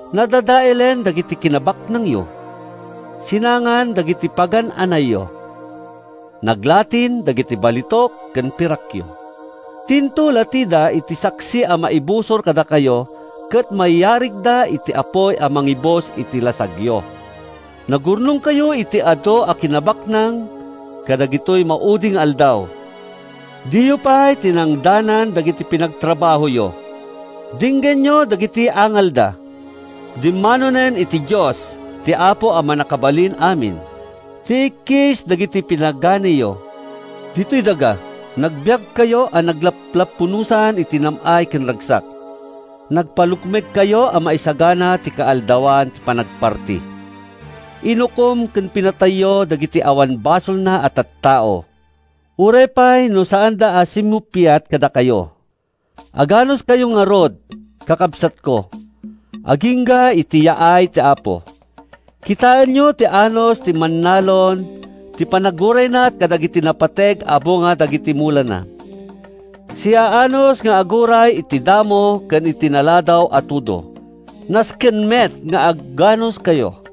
Nadadaelen dagiti kinabaknangyo. Sinangan dagiti pagan-anayyo. Naglatin dagiti balitok ken pirakyo. Tinto latida ti saksi a maibusor kadakayo ket mayarigda iti apuy a mangibus iti lasagyo. Nagurnongkayo iti adu a kinabaknang kadagitoy maudi nga aldaw. Diyo pay tinangdanan dagiti pinagtrabahoyo. Denggenyo dagiti angalda. Dimmanonen iti Dios, ti Apo a Mannakabalin-amin, ti ikkis dagiti pinaganiyo. Ditoy daga, nagbiagkayo a naglaplapunosan iti nam-ay ken ragsak. Nagpalukmegkayo a maisagana iti kaaldawan ti panagparti. Inukom ken pinatayyo dagiti awan basolna a tattao, uray pay no saanda a simmupiat kadakayo. Aganuskayo ngarud, kakabsatko, agingga iti yaay ti Apo. Kitaenyo ti anus ti mannalon iti panangurayna kadagiti napateg a bunga dagiti mulana. Siaanus nga aguray iti damo ken iti naladaw a tudo. Nasken met nga aganuskayo.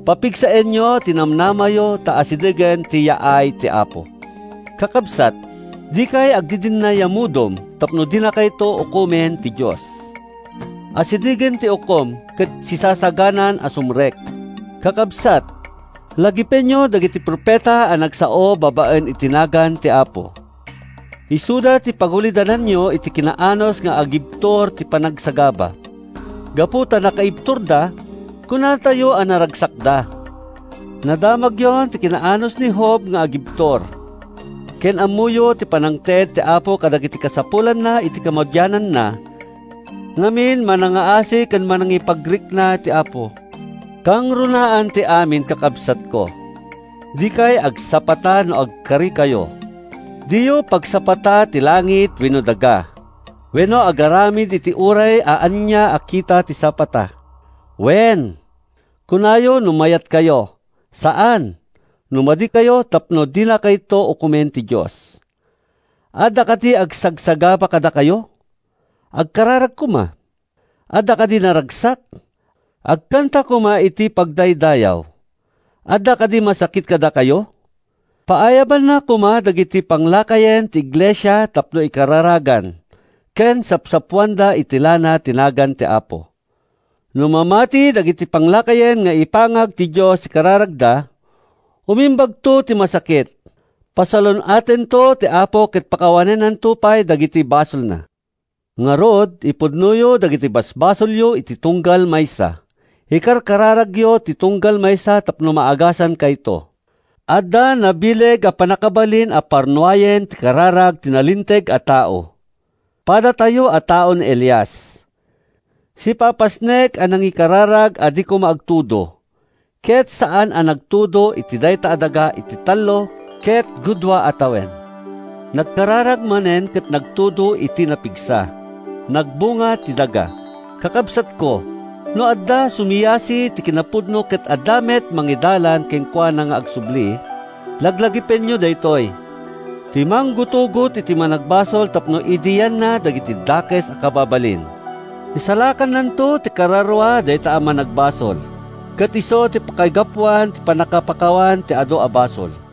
Papigsaenyo ti namnamayo ta asidegen ti yaay ti Apo. Kakabsat, dikay agdidinnayamudom tapno dinakayto ukomen ti Dios. Asidegen ti Ukom ket sisasaganan a sumrek. Kakabsat, lagipenyo dagiti profeta a nagsao babaen iti nagan ti Apo. Isuda ti pagulidananyo iti kinaanus nga agibtur iti panagsagaba. Gapu ta nakaibturda, kunatayo a naragsakda. Nadamagyon ti kinaanus ni Job nga agibtur ken ammoyo ti pannangted ti Apo kadagiti kasapulanna iti kamaudiananna. Ngamin, manangngaasi ken mannakipagrikna ti Apo. Kangrunaan ti amin, kakabsatko, dikay agsapata no agkarikayo. Diyo pagsapata ti langit wenno daga, wenno agaramat iti uray ania a kita ti sapata. “Wen,” kunayo no mayatkayo. “Saan,” no madikayo tapno dinakayto ukomen ti Dios. Adda kadi agsagsagaba kadakayo? Agkararag koma. Adda kadi naragsak? Agkanta koma iti pagdaydayaw. Adda kadi masakit kadakayo? Paayabanna koma dagiti panglakayen ti iglesia tapno ikararagan ken sapsapoanda iti lana iti nagan ti Apo. No mamati dagiti panglakayen nga ipangag ti Dios ti kararagda, umimbagto ti masakit; pasalun-atento ti Apo ket pakawanennanto pay dagiti basolna. Ngarud, ipudnoyo dagiti basbasolyo iti tunggal maysa. Ikarkararaganyo ti tunggal maysa tapno maagasankayto. Adda nabileg a pannakabalin a parnuayen ti kararag ti nalinteg a tao. Padatayo a tao ni Elias. Sipapasnek a nangikararag a di koma agtudo ket saan a nagtudo iti dayta a daga iti tallo ket gudua a tawen. Nagkararag manen ket nagtudo iti napigsa. Nagbunga ti daga. Kakabsatko, no adda sumiasi iti kinapudno ket adda met mangidalan kenkuana nga agsubli, laglagipenyo daytoy: ti manggutugot iti managbasol tapno idianna dagiti dakes a kababalin, isalakannanto ti kararua dayta a managbasol, ket isu ti pakaigapuan ti pannakapakawan ti adu a basol.